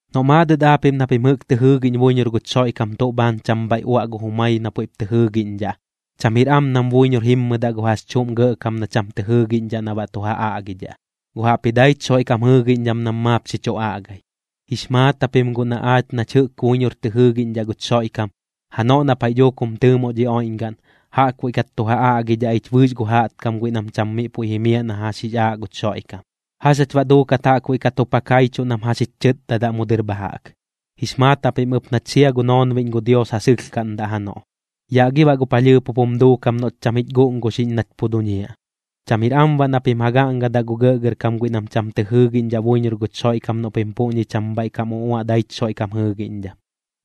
Noꞌ maadɨt aapiꞌm na pim jɨꞌk tɨ jɨɨgiꞌñ buiñor guch Xoiꞌkam tuꞌ bhaan cham bhaiꞌ uaꞌ gu jumai na puiꞌp tɨ jɨɨgiꞌñdhaꞌ, cham jir am nam buiñor jimmɨdaꞌ gu jax chuꞌm gɇꞌkam na cham tɨ jɨɨgiꞌñdhaꞌ na baꞌ tu ja aꞌgidhaꞌ, guꞌ jaꞌpji daich Xoiꞌkam jɨɨgiꞌñdham nam maap xi chu aꞌgai. Jix maat japim guꞌ na aach nach jɨꞌk buiñor tɨ jɨɨgiꞌñdhaꞌ guch Xoiꞌkam, janoꞌ na paiꞌ dhuuk jum tɨɨmoꞌ dhi oiꞌñgaꞌn, jaꞌkbuiꞌ kat tu ja aꞌgidhaꞌ ich bɨɨx gu jaꞌtkam guiꞌ nam cham miꞌ puiꞌ jimiaꞌ na jax jix aaꞌ guch Xoiꞌkam. ¿Jax jach baꞌ duukat jaꞌkbuiꞌ kat jup ja kaichuꞌ nam jax jich chɨtdadaꞌ mu dɨr bha jaꞌk? Jix maat japim ɨp nach sia gu noonbiꞌñ gu Dios ja sɨlhkaꞌndaꞌ janoꞌ. ¿Yaꞌ gi baꞌ gu palhɨɨp jup jum duukam noꞌch cham jich guꞌnguxiꞌñ nach pu duñiaꞌ? Cham jir am baꞌ na pim ja gaꞌngadaꞌ gu gɇꞌgɇrkam guiꞌ nam cham tɨ jɨɨgiꞌñdhaꞌ buiñor guch Xoiꞌkam noꞌ pim puꞌñi cham bhaiꞌ kam uꞌuaꞌ daich Xoiꞌkam jɨɨgiꞌñdham,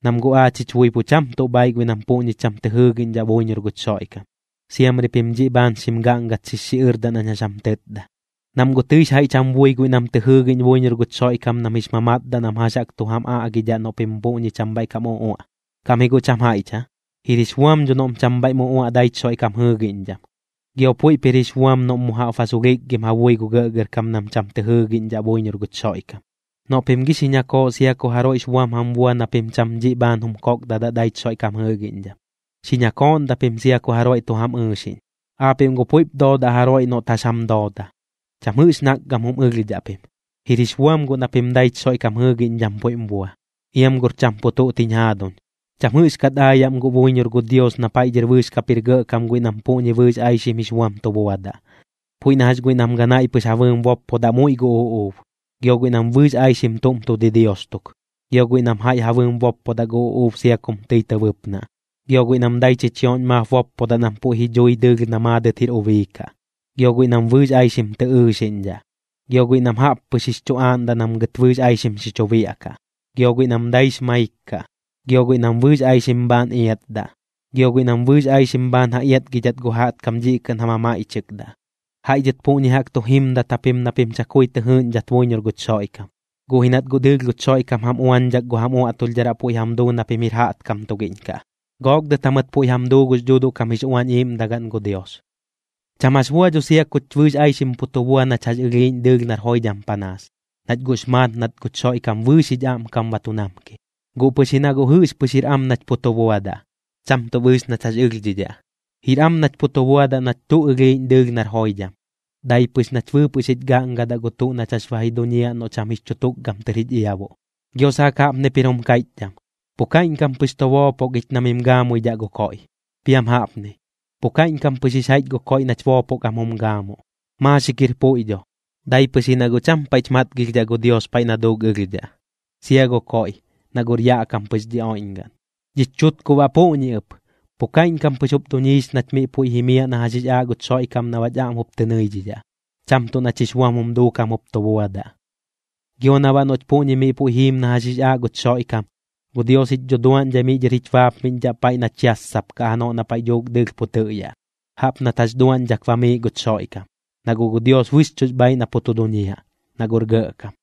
nam guꞌ aach jich bui pu cham tuꞌ bhaaiꞌ guiꞌ nam puꞌñi cham tɨ jɨɨgiꞌñdhaꞌ buiñor guch Xoiꞌkam. Siamri pim dhiꞌ bhaan xim gaꞌngat xix xiꞌɨrdaꞌ nañ jax jam tɨtda, nam guꞌ tɨix jaiꞌch jam bui guiꞌ nam tɨ jɨɨgiꞌñ buiñor guch Xoiꞌkam nam jix mamatdaꞌ nam jax jaꞌk tu jam aꞌgidhaꞌ noꞌ pim puꞌñi cham bhaiꞌ kam uꞌuaꞌ. ¿Kaꞌm ji guꞌ cham jaiꞌch aa? Jir jix buam dho noꞌm cham bhaiꞌm uꞌuaꞌ daich Xoiꞌkam jɨɨgiꞌñdham, gio puiꞌp jir jix buam noꞌm mu jaꞌp ba sulhikgim ja bui gu gɇꞌgɇrkam nam cham tɨ jɨɨgiꞌñdhaꞌ buiñor guch Xoiꞌkam. Noꞌ pim gi xi ñakooꞌ sia ku jaroiꞌx buam jam bua na pim cham dhiꞌ bhaan jum kokdadaꞌ daich Xoiꞌkam jɨɨgiꞌñdham, xi ñakooꞌndaꞌ pim sia ku jaroiꞌ tu jam ɨɨxiꞌñ. Aapiꞌm guꞌ puiꞌp doodaꞌ jaroiꞌ noꞌt jax jam dooda, cham jɨꞌx nakgam jum ɨlhdhaꞌ pim. Jir jix buam guꞌ na pim daich Xoiꞌkam jɨɨgiꞌñdham puiꞌm bua. Iam guꞌr cham pu tuꞌt jiñ jaaduñ, cham jɨꞌxkat aayaꞌm guꞌ buiñor gu Dios na paiꞌ dhɨr bɨɨx kap jir gɇꞌkam guiꞌ nam puꞌñi bɨɨx aixim jix buam tu buadaꞌ. Puiꞌ na jax guiꞌ nam ganaiꞌ pɨx ja bɨɨm boppodaꞌ muiꞌ gu uꞌuub, gio guiꞌ nam bɨɨx aixim tuꞌm tu didios tuk. Gio guiꞌ nam jaiꞌ ja bɨɨm boppodaꞌ gu uꞌuub sia kum tɨi tɨ bɨpnaꞌ. Gio guiꞌ nam dai chichioꞌñ maap boppodaꞌ nam puiꞌ ji dhui dɨɨlh na maadɨt jir ubii kaꞌ. Gio guiꞌ nam bɨɨx aixim tɨ ɨɨxiꞌñdhaꞌ. Gio guiꞌ nam jaꞌp pɨx jix chu aaꞌndaꞌ nam gɨt bɨɨx aixim xi chu biaꞌkaꞌ. Gio guiꞌ nam daix maik kaꞌ. Gio guiꞌ nam bɨɨx aixim bhaan iatdaꞌ. Gio guiꞌ nam bɨɨx aixim bhaan ja iatgidhat gu jaꞌtkam dhiꞌ kɨꞌn ja mamaiꞌchɨkdaꞌ. Jaiꞌ dhɨt puꞌñi jaꞌk tu jimdat japim na pim chakui tɨ jɨɨꞌñdhat buiñor guch Xoiꞌkam, guꞌ ji nat guꞌ dɨɨlh guch Xoiꞌkam jam uañdhak gu jam uaꞌtulhdharaꞌ puiꞌ jam duu na pim jir jaꞌtkam tugiꞌñ kaꞌ, gook dɨt jamɨt puiꞌ jam duu gux Dhuuduꞌ kam jix Uañ Iiꞌmdagaꞌn gu Dios. Cham jax bua dho tɨi sia kuch bɨɨx aixim pu tu bua nach jax ɨlhiiꞌñ dɨɨlh nar joidham panaas, nach guꞌx maat nat guch Xoiꞌkam bɨɨx jich aꞌmkam ba tu namki. Guꞌ pɨx ji na guꞌ jɨꞌx pɨx jir am nach pu tu buadaꞌ, cham tuꞌ bɨɨx nach jax ɨlhdhidhaꞌ. Jir am nach pu tu buadaꞌ nach tuꞌ ɨlhiiꞌñ dɨɨlh nar joidham, dai pɨx nach bɨɨpɨꞌ xich gaꞌngadaꞌ gu tuꞌ nach jax ba ji duñiaꞌ noꞌ cham jix chu tukgam tɨr jich iabuꞌ. Gio saak jaꞌpnip jir jum kaiꞌchdham: “Pu kaiꞌñkam pɨx tu boopok ich na mim gaamuidhaꞌ gu koiꞌ.” Piam jaꞌpni: “Pu kaiꞌñkam pɨx jix jaiꞌch gu koiꞌ nach boopok am jum gaamuꞌ.” Maaxik jir puiꞌ dho, dai pɨx ji na guꞌ cham paiꞌch matgilhdhaꞌ gu Dios paiꞌ na duuk ɨlhdhaꞌ, sia gu koiꞌ, na guꞌr yaꞌ kam pɨx dhi oiꞌñgaꞌn. Dhich chutkuꞌ baꞌ puꞌñi ɨp, pu kaiꞌñkam pɨx jup duñiix nach miꞌ puiꞌ jimiaꞌ na jax jix aaꞌ guch Xoiꞌkam na baꞌch aꞌm jup tɨ nɨidhidhaꞌ, cham tuꞌ nach jix buam jum duukam jup tu buadaꞌ. Gio na baꞌ noꞌch puꞌñi miꞌ puiꞌ jiim na jax jix aaꞌ guch Xoiꞌkam, gu Dios jich dhuduaꞌñdhai miꞌ dhɨr jich baapmiꞌñdhaꞌ paiꞌ nach yassapkaꞌ janoꞌ na paiꞌ dhuuk dɨɨlh pu tɨꞌyaꞌ, jaꞌp nat jax duaꞌñdhak bamiiꞌ guch Xoiꞌkam. Na guꞌ gu Dios bɨxchuꞌx bhaaiꞌ na pu tu duñiaꞌ, na guꞌr Gɇꞌkam.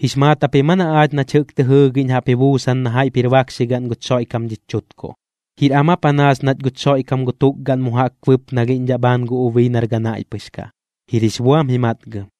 ¿Jix maat japim aa na aach nach jɨꞌk tɨ jɨɨgiꞌñ jaꞌp ji buusan na jaiꞌp jir bakxigaꞌn guch Xoiꞌkam dhich chutkuꞌ? ¿Jir am aa panaas nach guch Xoiꞌkam gu tukgaꞌn mu jaꞌk bɨpnalhiꞌñdhaꞌ bhaan gu ubii nar ganaiꞌ pɨx kaꞌ? Jir jix buam ji matgɨm.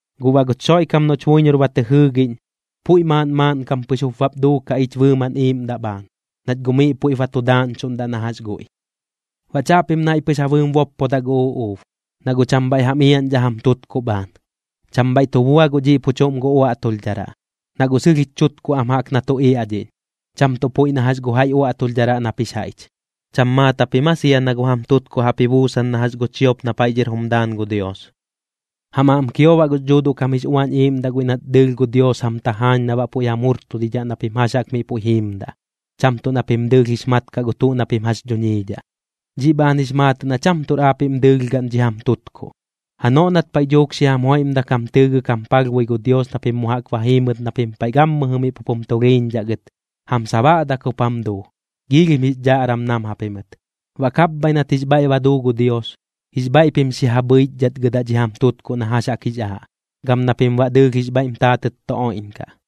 Guꞌ baꞌ guch Xoiꞌkam noꞌch buiñor ba tɨ jɨɨgiꞌñ, puiꞌ maaꞌn maaꞌnkam pɨx jup bap duukaꞌ ich bɨɨmaꞌn iiꞌmdaꞌ bhaan, nach guꞌ miꞌ puiꞌp ba tu daaꞌñchuꞌndaꞌ na jax guiꞌ. Baꞌ chaꞌpim naiꞌ pɨx ja bɨɨm boppodaꞌ gu uꞌuub, na guꞌ cham bhaiꞌ jam iaꞌñdhaꞌ jam tutkuꞌ bhaan. Cham bhaiꞌ tu bua guꞌ dhiꞌ pu chuꞌm gu uaꞌtulhdharaꞌ, na guꞌ sɨlh jich chutkuꞌ am jaꞌk na tu iaꞌdhiꞌñ, cham tuꞌ puiꞌ na jax gu jaiꞌ uaꞌtulhdharaꞌ nap jix jaiꞌch. ¿Cham maat japim aa sia na gu jam tutkuꞌ jaꞌp ji buusan na jax gu chiop na paiꞌ dhɨr jum daan gu Dios? Jam aꞌm kio baꞌ gux Dhuuduꞌ kam jix Uañ Iiꞌmdaꞌ guiꞌ nat dɨɨlh gu Dios jam tajaañ na baꞌ puiꞌ jam jurtudidhaꞌ na pim jax jaꞌk miꞌ puiꞌ jiimdaꞌ, cham tuꞌ na pim dɨɨlh jix mat kaꞌ gu tuꞌ na pim jax duñiidhaꞌ. Dhiꞌ bhaan jix maatɨꞌ na cham tuꞌr aapiꞌm dɨɨlh gaꞌn dhi jam tutkuꞌ. Janoꞌ nat paiꞌ dhuuk xi jam joiꞌmdak jam tɨɨgɨk jam palhbui gu Dios na pim mu jaꞌk ba jiimɨt na pim paiꞌ gammɨjɨ miꞌ pup jum tulhiiñdhaꞌ gɨt, jam sabaꞌdak jup jam duu, giilhim jix dhaꞌram nam japimɨt. Baꞌ kapbhaiꞌ nat jix bhaiꞌ ba duu gu Dios, jix bhaiꞌ pim xi ja bhɨichdhatgɨdaꞌ dhi jam tutkuꞌ na jax jaꞌk jix aaꞌ, gam na pim baꞌ dɨɨlh jix bhaiꞌm taatɨt tu oiꞌñkaꞌ.